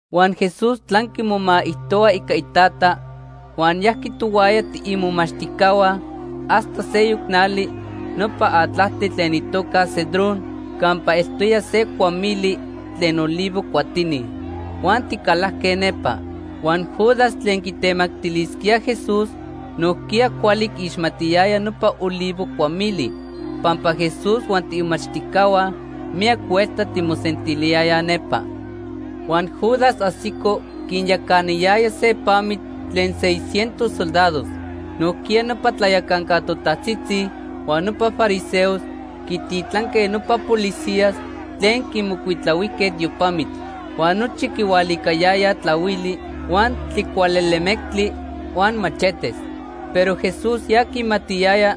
Huan Jesús tlanqui momaijtohua ica iTata huan yajqui tohuaya tiimomachtijcahua hasta seyoc nali nopa atlajtli tlen itoca Cedrón campa eltoya se cuamili tlen olivo cuatini. Huan ticalajque nepa. Huan Judas tlen quitemactilisquía Jesús nojquiya cuali quiixmatiyaya nopa olivo cuamili pampa Jesús huan tiimomachtijcahua miyac huelta timosentiliyayaj nepa. Huan Judas ajsico quinyacanayaya se pamitl tlen seis cientos soldados. Nojquiya nopa tlayacanca totajtzitzi huan nopa fariseos quititlanque nopa policías tlen quimocuitlahuijque tiopamitl. Huan nochi quihualicayayaj tlahuili, huan tlicualelemectli huan machetes. Pero Jesús ya quimatiyaya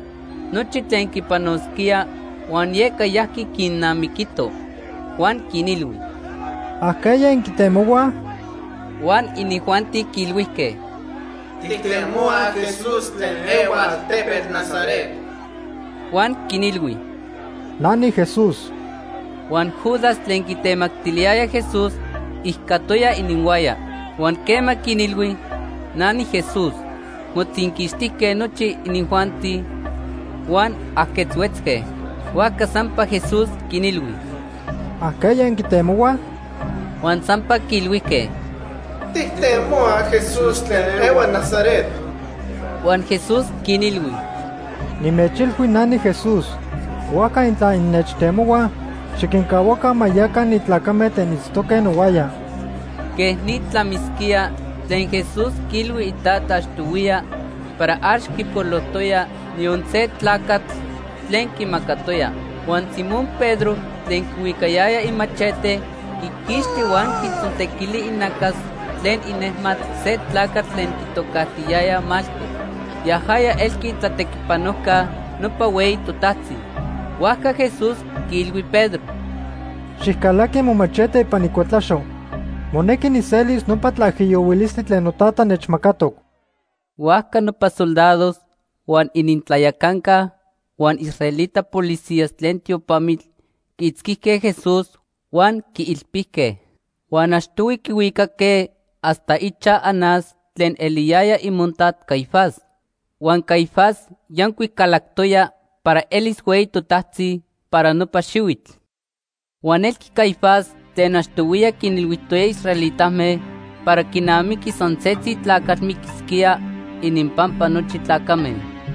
nochi tlen quipanosquía huan yeca yajqui quinnamiquito. Huan quinilhui: ―¿Ajqueya inquitemohuaj? Huan inijuanti quiilhuijque: ―Tijtemohuaj Jesús tlen ehua altepetl Nazaret. Huan quinilhui: ―Na niJesús. Huan Judas tlen quitemactiliyaya Jesús ijcatoya ininhuaya. Huan quema quinilhui: “Na niJesús”, motzinquixtijque nochi inijuanti huan ajquetzhuetzque. Huajca sampa Jesús quinilhui: ―¿Ajqueya inquitemohuaj? Huan sampa quiilhuijque: ―Tijtemohuaj Jesús tlen ehua Nazaret. Huan Jesús quinilhui: ―Nimechilhui na niJesús. Huajca intla innechtemohuaj, xiquincahuaca ma yaca ni tlacame tlen itztoque nohuaya. Quej ni tlamisquía tlen Jesús quiilhui iTata achtohuiya para ax quipolojtoya niyon se tlacatl tlen quimacatoya. Huan Simón Pedro tlen quihuicayaya imachete, quiquixti huan quitzontequili inacas tlen inejmatl se tlacatl tlen quitocajtiyayaj Malco. Yajaya elqui itlatequipanojca nopa hueyi totajtzi. Huajca Jesús quiilhui Pedro: ―Xijcalaqui momachete ipan icuetlaxo. Monequi nijselis nopa tlaijiyohuilistli tlen noTata nechmacatoc. Huajca nopa soldados, huan inintlayacanca huan israelita policías tlen tiopamitl quiitzquijque Jesús huan quiilpijque. Huan achtohui quihuicaque hasta ichaj Anás tlen eliyaya imontat Caifás. Huan Caifás yancuic calactoya para elis hueyi totajtzi para nopa xihuitl. Huan elqui Caifás tlen achtohuiya quinilhuijtoya israelitame para quinamiqui san setzi tlacatl miquisquía ininpampa nochi tlacame.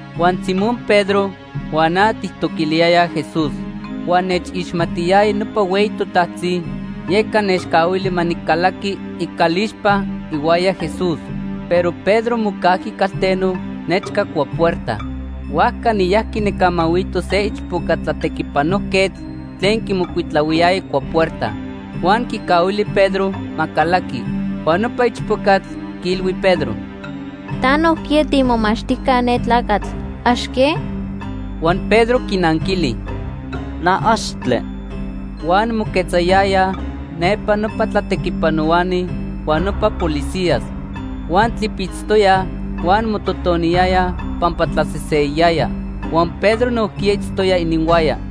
Huan Simón Pedro huan na tijtoquiliyayaj Jesús. Huan nechixmatiyaya nopa hueyi totajtzi, yeca nechcahuili ma nicalaqui icalixpa ihuaya Jesús. Pero Pedro mocajqui calteno nechca cuapuerta. Huajca niyajqui nijcamahuito se ichpoca tlatequipanojquetl tlen quimocuitlahuiyaya cuapuerta. Huan quicahuili Pedro ma calaqui. Huan nopa ichpocatl quiilhui Pedro: ―Ta nojquiya tiimomachtijca ne tlacatl. ¿Ax que? Huan Pedro quinanquili: ―Na, axtle. Huan moquetzayayaj nepa nopa tlatequipanohuani huan nopa policías. Huan tlipitztoyaj huan mototoniyayaj pampa tlaseseyayaya. Huan Pedro nojquiya itztoya ininhuaya.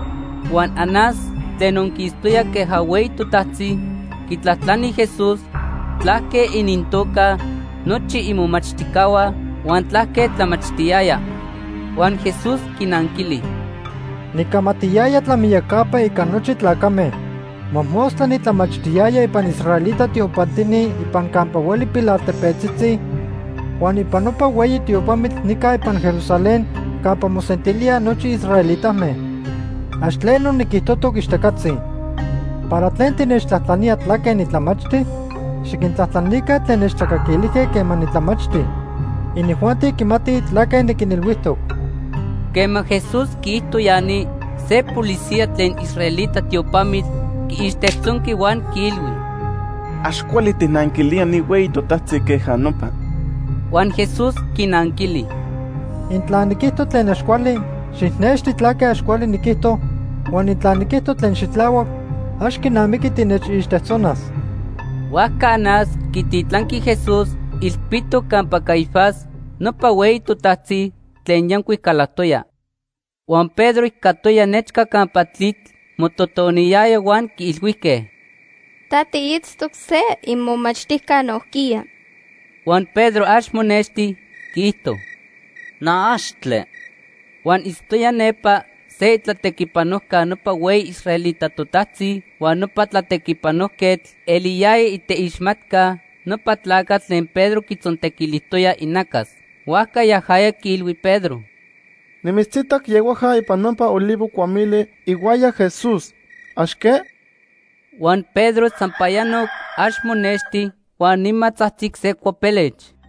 Huan Anás tlen onquistoya queja hueyi totajtzi quitlajtlani Jesús tlaque inintoca nochi imomachtijcahua huan tlaque tlamachtiyaya. Huan Jesús quinanquili: ―Nicamatiyaya tlamiyacapa ica nochi tlacame. Mojmostla nitlamachtiyaya ipan israelita tiopantini ipan campa hueli pilaltepetzitzi huan ipan nopa hueyi tiopamitl nica ipan Jerusalén campa mosentilíaj nochi israelitame. Ax tleno niquijtojtoc ixtacatzi. ¿Para tlen tinechtlajtlanía tlaque nitlamachti? Xiquintlajtlanica tlen nechtlacaquilijque quema nitlamachti. Inijuanti quimatij tlaque niquinilhuijtoc. Quema Jesús quiijto ya ni, se policía tlen israelita tiopamitl quiixtejtzonqui huan quiilhui: ―Ax cuali tijnanquilía ni hueyi totajtzi queja nopa. Huan Jesús quinanquili: ―Intla niquijto tlen ax cuali, xijnexti tlaque ax cuali niquijto, huan intla niquijto tlen xitlahuac, ax quinamiqui tinechixtejtzonas. Huajca Anás quititlanqui Jesús ilpitoc campa Caifás nopa hueyi totajtzi tlen yancuic calactoya. Huan Pedro ijcatoya nechca campa tlitl mototoniyaya huan quiilhuijque: ―Ta tiitztoc se imomachtijca nojquiya. Huan Pedro ax monexti, quiijto: ―Na, axtle. Huan itztoya nepa se itlatequipanojca nopa hueyi israelita totajtzi huan nopa tlatequipanojquetl eliyaya iteixmatca nopa tlacatl tlen Pedro quitzontequilijtoya inacas. Huajca yajaya quiilhui Pedro: ―Nimitzitac yehuaja ipan nopa olivo cuamili ihuaya Jesús. ¿Ax que? Huan Pedro sampayanoc ax monexti, huan nima tzajtzic se cuapelech.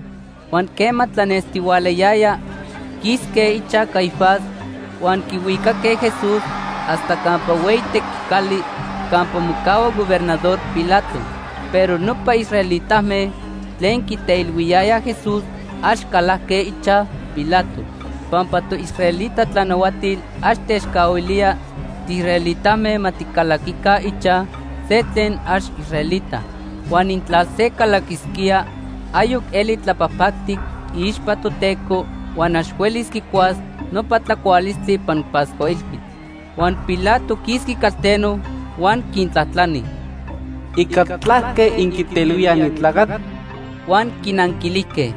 Huan quema tlanestihualayaya quisque ichaj Caifás huan quihuicaque Jesús hasta campa hueyi tequicali campa mocahua Gobernador Pilato. Pero nopa israelitame tlen quiteilhuiyayaj Jesús ax calajque ichaj Pilato. Pampa toisraelita tlanahuatil ax techcahuilía tiisraelitame ma ticalaquica ichaj se tlen ax israelita. Huan intla se calaquisquía, ayoc eli tlapajpactic iixpa Toteco huan ax huelis quicuas nopa tlacualistli ipan Pascua Ilhuitl. Huan Pilato quisqui calteno huan quintlajtlani: ―¿Ica tlaque inquiteilhuíaj ni tlacatl? Huan quinanquilijque: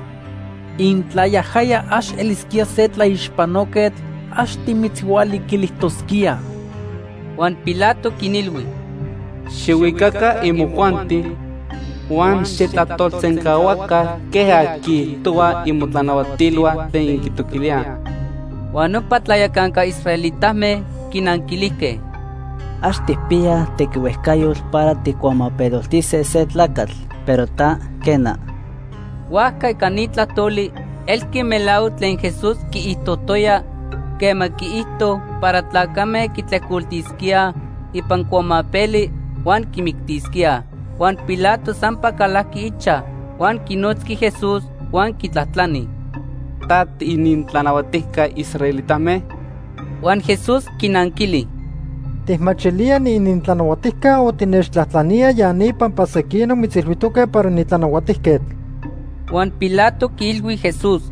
―Intla yajaya ax elisquía se tlaixpanoquetl, ax timitzhualiquilijtosquíaj. Huan Pilato quinilhui: ―Xijhuicaca imojuanti huan xijtlajtolsencahuaca queja quiijtohuaj imotlanahuatilhua tlen inquitoquilíaj. Huan nopa tlayacanca israelitame quinanquilijque: ―Ax tijpiyaj tequihuejcayotl para tijcuamapeloltise se tlacatl, pero ta, quena. Huajca ica ni tlajtoli elqui melahuac tlen Jesús quiijtojtoya quema quiijto para tlacame quitlejcoltisquíaj ipan cuamapeli huan quimictisquíaj. Huan Pilato sampa calajqui ichaj huan quinotzqui Jesús huan quitlajtlani: ―¿Ta tiinintlanahuatijca israelitame? Huan Jesús quinanquili: ―¿Tijmachilía niinintlanahuatijca o tinechtlajtlanía ya ni pampa sequinoc mitzilhuijtoque para nitlanahuatijquetl? Huan Pilato quiilhui Jesús: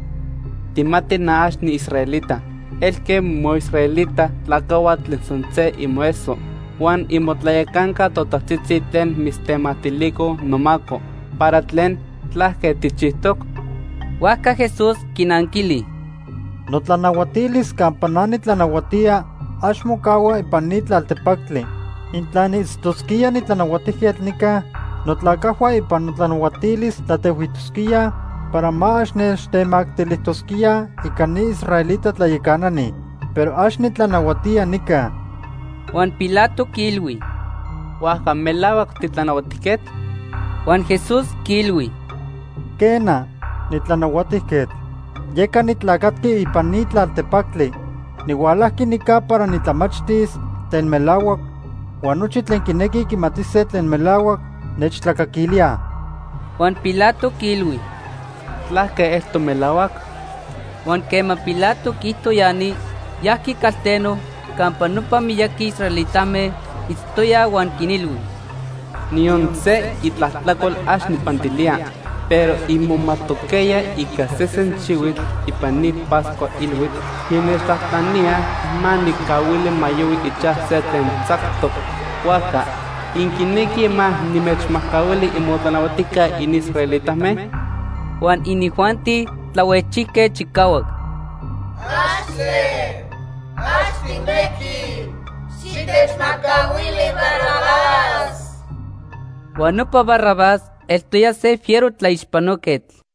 ―Tijmati na ax niisraelita. Elque moisraelita tlacajhua tlen san se imoeso huan imotlayacanca totajtzitzi tlen mitztemactilicoj nomaco. ¿Para tlen? ¿Tlaque tijchijtoc? Huajca Jesús quinanquili: ―Notlanahuatilis campa na nitlanahuatía ax mocahua ipan ni tlaltepactli. Intla niitztosquía nitlanahuatijquetl nica, notlacajhua ipan notlanahuatilis tlatehuijtosquíaj para ma ax nechtemactilijtosquíaj ica ni israelita tlayacanani. Pero ax nitlanahuatía nica. Huan Pilato quiilhui: ―¿Huajca melahuac titlanahuatijquetl? Huan Jesús quiilhui: ―Quena, nitlanahuatijquetl. Yeca nitlacatqui ipan ni tlaltepactli. Nihualajqui nica para nitlamachtis tlen melahuac huan nochi tlen quinequij quimatise tlen melahuac nechtlacaquilíaj. Huan Pilato quiilhui: ―¿Tlaque eltoc melahuac? Huan quema Pilato quiijto ya ni, yajqui calteno campa nopa miyaqui israelitame itztoyaj huan quinilhui: ―Niyon se itlajtlacol ax nijpantilía. Pero inmomajtoquejya ica sesen xihuitl ipan ni Pascua Ilhuitl, innechtlajtlaníaj ma nijcahuili ma yohui ichaj se tlen tzactoc. Huajca, ¿inquinequij ma nimechmajcahuili imotlanahuatijca inisraelitame? Huan inijuanti tlahuejchijque chicahuac: ―¡Axtle! ¡Ax tijnequij! Xitechmajcahuili Barrabás. Huan nopa Barrabás eltoya se fiero tlaixpanoquetl.